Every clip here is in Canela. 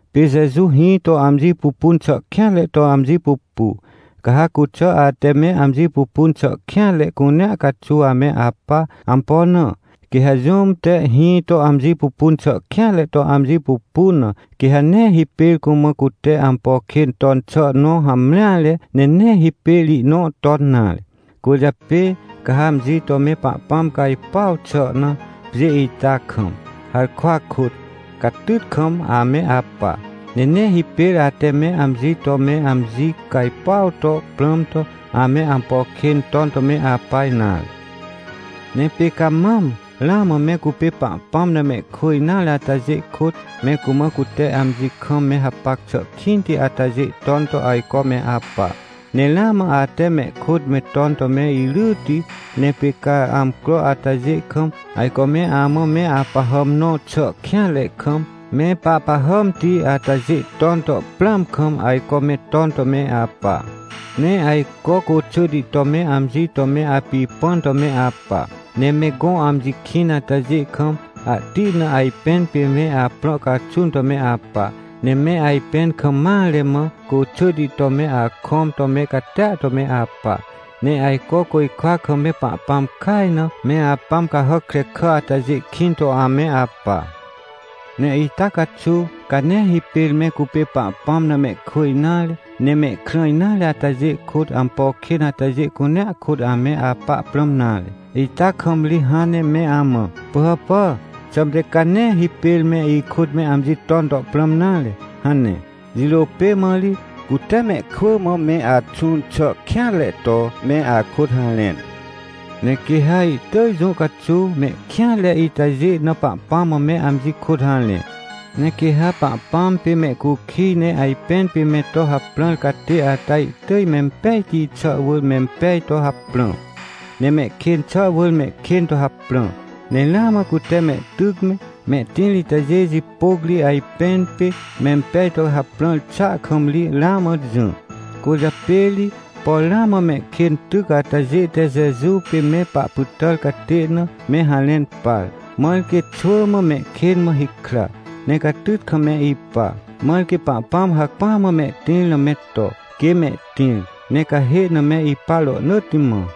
Pê Jeju hĩ to amji pupun xà kêanre to amji pupu. Ca ha cuxà ate me amji pupun xà kêanre cunea caxuw ame apa. Ampo na? Quê ha jũm te hĩ to amji pupun xà kêanre to amji pupun na, quê ha nee hipêr cumã cute ampo kên ton xà nõ hamreare, ne nee hipêr ihnõ ton nare. Cwỳrjapê, ca ha amji to me Pahpãm cajpuaw xà na, pjê ita kam, harkwa kôt, catyt kam ame apa. Ne nee hipêr ate me amji to me amji cajpuaw to prãm to, ame ampo kên ton to me apa nare. Ne pê ca mam, ramã me cupê Pahpãm na mehkwỳ nare atajê kôt, me cumã cute amji kam me hapac xà kĩnti atajê ton to ajco me apa. Ne ramã ate mehkôt me ton to me iryyti. Ne pê ca amcro atajê kam, ajco me amã me apahàm nõ xà kêanre kam, me pahpahàmti atajê ton to prãam kam, ajco me ton to me apa. Ne ajco côxỳhti to me amji to me apipãn to me apa. Ne me gõ amji kĩn atajê kam, ahti na ajpẽn pê me aprõ caxun to me apa. Ne me ajpẽn kam mare mã, côxỳhti to me akõm to me catia to me apa. Ne ajco côjkwa kam me Pahpãm kaj na, me apãm cahàc krekà atajê kĩn to ame apa. Ne ita caxuw, ca nee hipêr me cupê Pahpãm na mehkwỳ nare, ne mehkrã nare atajê kôt, ampo kên atajê cunea kôt ame apa prãm nare. Ita kam ri hãn ne me amã: — Pỳhàpà, xãmte ca nee hipêr me ikôt me amji ton to prãm nare — hane. Jirô pê mã ri, cute mehkwỳ mã me axũn xà kêanre to, me akôt harẽn. Ne quê ha ihtỳj jũ caxuw, mehkêanre itajê na Pahpãm mã me amji kôt harẽ. Ne quê ha Pahpãm pê mehcukij ne ajpẽn pê me to haprãr catê ata ihtỳj mempejti xà wỳr mempej to haprã, ne mehkên xà wỳr mehkên to haprã. Ne ramã cute mehtyc me, mehtĩr itajê jipôc ri ajpẽn pê mempej to haprãr xàa kam ri ramã jỹ. Cwỳrjapê ri, por ramã mehkên tyc atajê te Jeju pê me pahpytàr catê na, me harẽn par. Mãr quê xwỳ mã mehkên mã hikra, ne catyt kam me ipa. Mãr quê Pahpãm hacpỹa mã mehtĩr na me to, quê mehtĩr, ne cahê na me ipa rohnỳtti mã.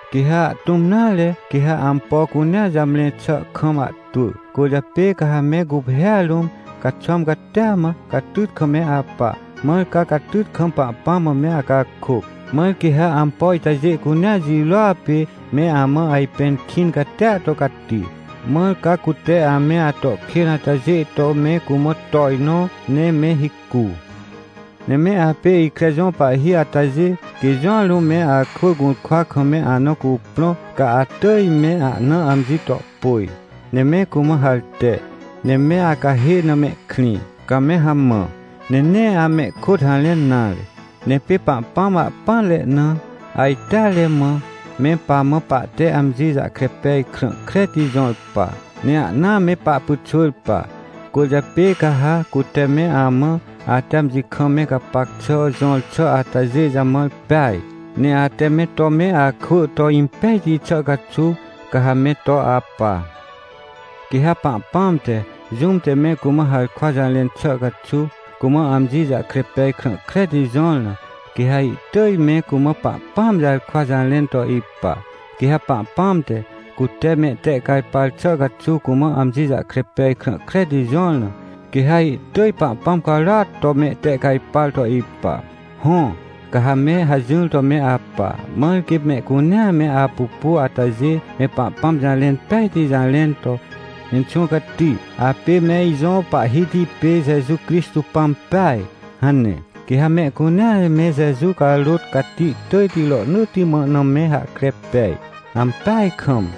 Quê ha ahtũm nare, quê ha ampo cunea jamre xà kam ahtwỳ. Cwỳrjapê ca ha me guphêa rũm, caxwãm catia mã, catyt kam me apa, mãr ca catyt kam Pahpãm mã me acakôc. Mãr quê ha ampo itajê cunea jirôa pê, me amã ajpẽn kĩn catia to cati, mãr ca cute ame ato kên atajê to me cumã tojnõ, ne me hicu. Ne me apê ikre jõ pahhi atajê, quê jũa rũm me akwỳ gũrkwa kam me ana cuprõ, ca atỳj me ahna amji to pôj, ne me cumã harte, ne me acahê na mehkrĩ, ca me hamã, ne nee amehkôt harẽn nare. Ne pê Pahpãm ahpỹanre na, ajteare mã, me pamã pahte amji jahkre pej krã kreti jõr pa, ne ahna me pahpyxwỳr pa. Cwỳrjapê ca ha, cute me amã, ate amji kam me gapac xà jõr xà atajê jamãr peaj, ne ate me to me akwỳ to impejti xà caxuw, ca ha me to apa. Quê ha Pahpãm te, jũm te me cumã harkwa jarẽn xà caxuw, cumã amji jahkre pej krã kreti jõr na, quê ha ihtỳj me cumã Pahpãam jarkwa jarẽn to ipa. Quê ha Pahpãm te, cute mehtehcajpar xà caxuw cumã amji jahkre pej krã kreti jõr na, quê ha ihtỳj Pahpãm carôat to mehtehcajpar to ipa. Hõ, ca ha me hajỹr to me apa, mãr quê mehcunea me apupu atajê, me Pahpãm jarẽn pejti jarẽn to: — Inxũ Cati, apê me ijõ Pahhiti pê Jeju Crixtô Pãm peaj — hane. Quê ha mehcunea me Jeju carôt cati tỳjti rohnỳtti mã na me hahkre pej. Ampeaj kam!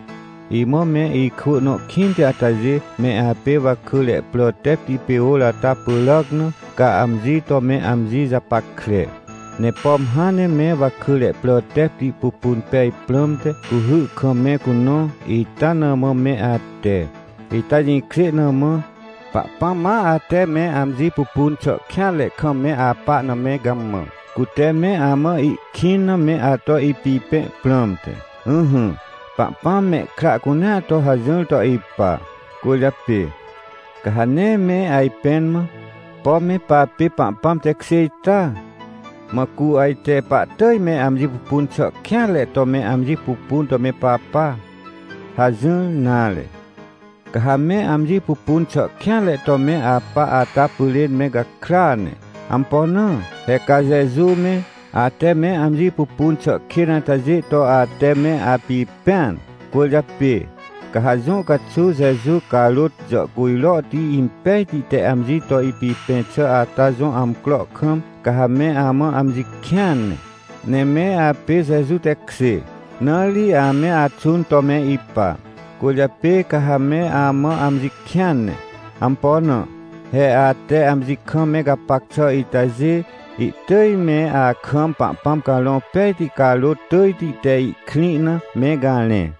Imã me ikwỳ nõ kĩnti atajê, me apê wakỳre prà tepti pê ôr ata pyràac na, ca amji to me amji japackre. Ne pom hãn ne me wakỳre prà tepti pupun pej prãmte, cuhy kam me cunõ, ita na mã me ate. Ita jĩkjê na mã, Pahpãm ma ate me amji pupun xà kêanre kam me apa na me gamã, cute me amã ihkĩn na me ato ipipẽ prãmte. Ỹhỹ, Pahpãm mehkra cunea to hajỹr to ipa. Cwỳrjapê, ca ha nee me ajpẽn mã: — Pom me papê Pahpãm tekjê ita? Mã cu ajte pahtỳj me amji pupun xà kêanre to me amji pupun to me papa? — hajỹr nare. Ca ha me amji pupun xà kêanre to me apa ata pyrên me gakrya ne. Ampo na? He ca Jeju me, ate me amji pupun xà kên atajê to ate me apipẽan. Cwỳrjapê, ca ha jũ caxuw Jeju carôt jàhcujrohti impejti te amji to ipipẽ xà ata jõ amcro kam, ca ha me amã amji kĩan ne. Ne me apê Jeju tekjê, na ri ame axũn to me ipa. Cwỳrjapê ca ha me amã amji kĩan ne. Ampo na? He ate amji kam me gapac xà itajê, ihtỳj me akam Pahpãm Carõ Pejti carôt tỳjti te ihkrĩ na, me garẽ.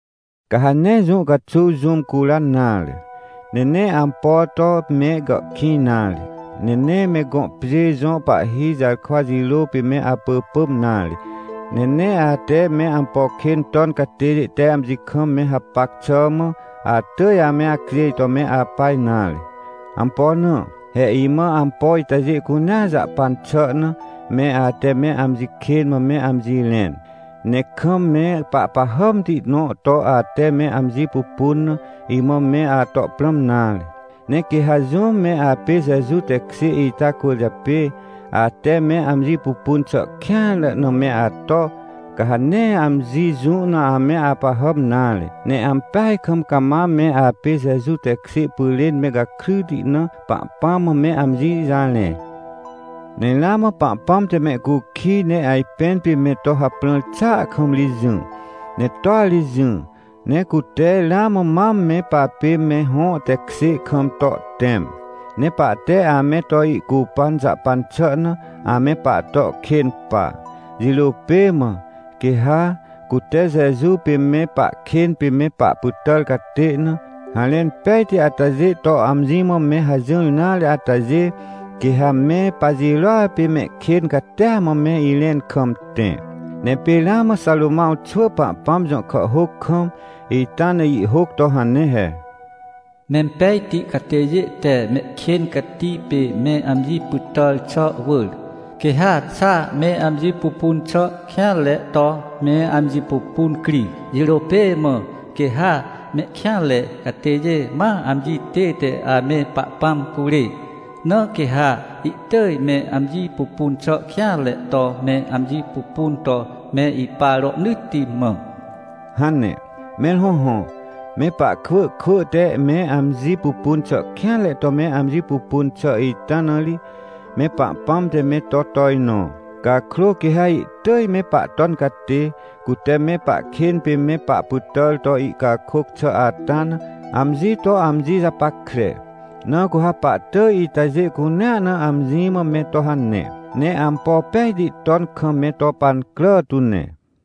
Ca ha nee jũ caxuw jũm curan nare, ne nee ampo to me gàhkĩj nare, ne nee me gõ pjê jõ pahhi jarkwa jirô pê me apỳpỳm nare, ne nee ate me ampo kên ton catêjê te amji kam me hapac xà mã, atỳj ame acjêj to me apa nare. Ampo na? He imã ampo itajê cunea jahpan xà na, me ate me amji kên mã me amji rẽn, ne kam me pahpahàmti nõ to ate me amji pupun na, imã me ato prãm nare. Ne quê ha jũm me apê Jeju tekjê ita cwỳrjapê, ate me amji pupun xà kêanre na me ato, ca ha nee amji jũ na ame apahàm nare, ne ampeaj kam cama me apê Jeju tekjê pyrên me gakryti na, Pahpãm mã me amji jarẽ. Ne ramã Pahpãm te mehcukij ne ajpẽn pê me to haprãr xàa kam ri jỹ, ne toa ri jỹ. Ne cute ramã mam me papê me hõ tekjê kam to ihtẽm, ne pahte ame to ihcupan jahpan xà na, ame pahto kên pa. Jirô pê mã, quê ha, cute Jeju pê me pahkên pê me pahpytàr catê na, harẽn pejti atajê to amji mã me hajỹr nare atajê, quê ha me pajirôa pê mehkên catia mã me irẽn kam tẽ. Ne pê ramã Xarômãw xwỳ Pahpãm jõ kàhhôc kam, ita na ihhôc to hane he: “Mempejti catêjê te mehkên cati pê me amji pytàr xà wỳr, quê ha xa me amji pupun xà kêanre to me amji pupun cri. Jirô pê mã quê ha mehkêanre catêjê ma amji tête ame Pahpãm curê, na quê ha ihtỳj me amji pupun xà kêanre to me amji pupun to me ipa rohnỳtti mã” hane. Mẽr hõhõ, me pahkwỳ kwỳ te me amji pupun xà kêanre to me amji pupun xà ita na ri, me Pahpãm te me to tojnõ. Cakrô quê ha ihtỳj me Pahton Catê, cute me pahkên pê me pahpytàr to ihcakôc xà ata na, amji to amji japackre. Na cu ha pahtỳj itajê cunea na amji mã me to hane, ne ampo pejti ton kam me to pancrà tu ne.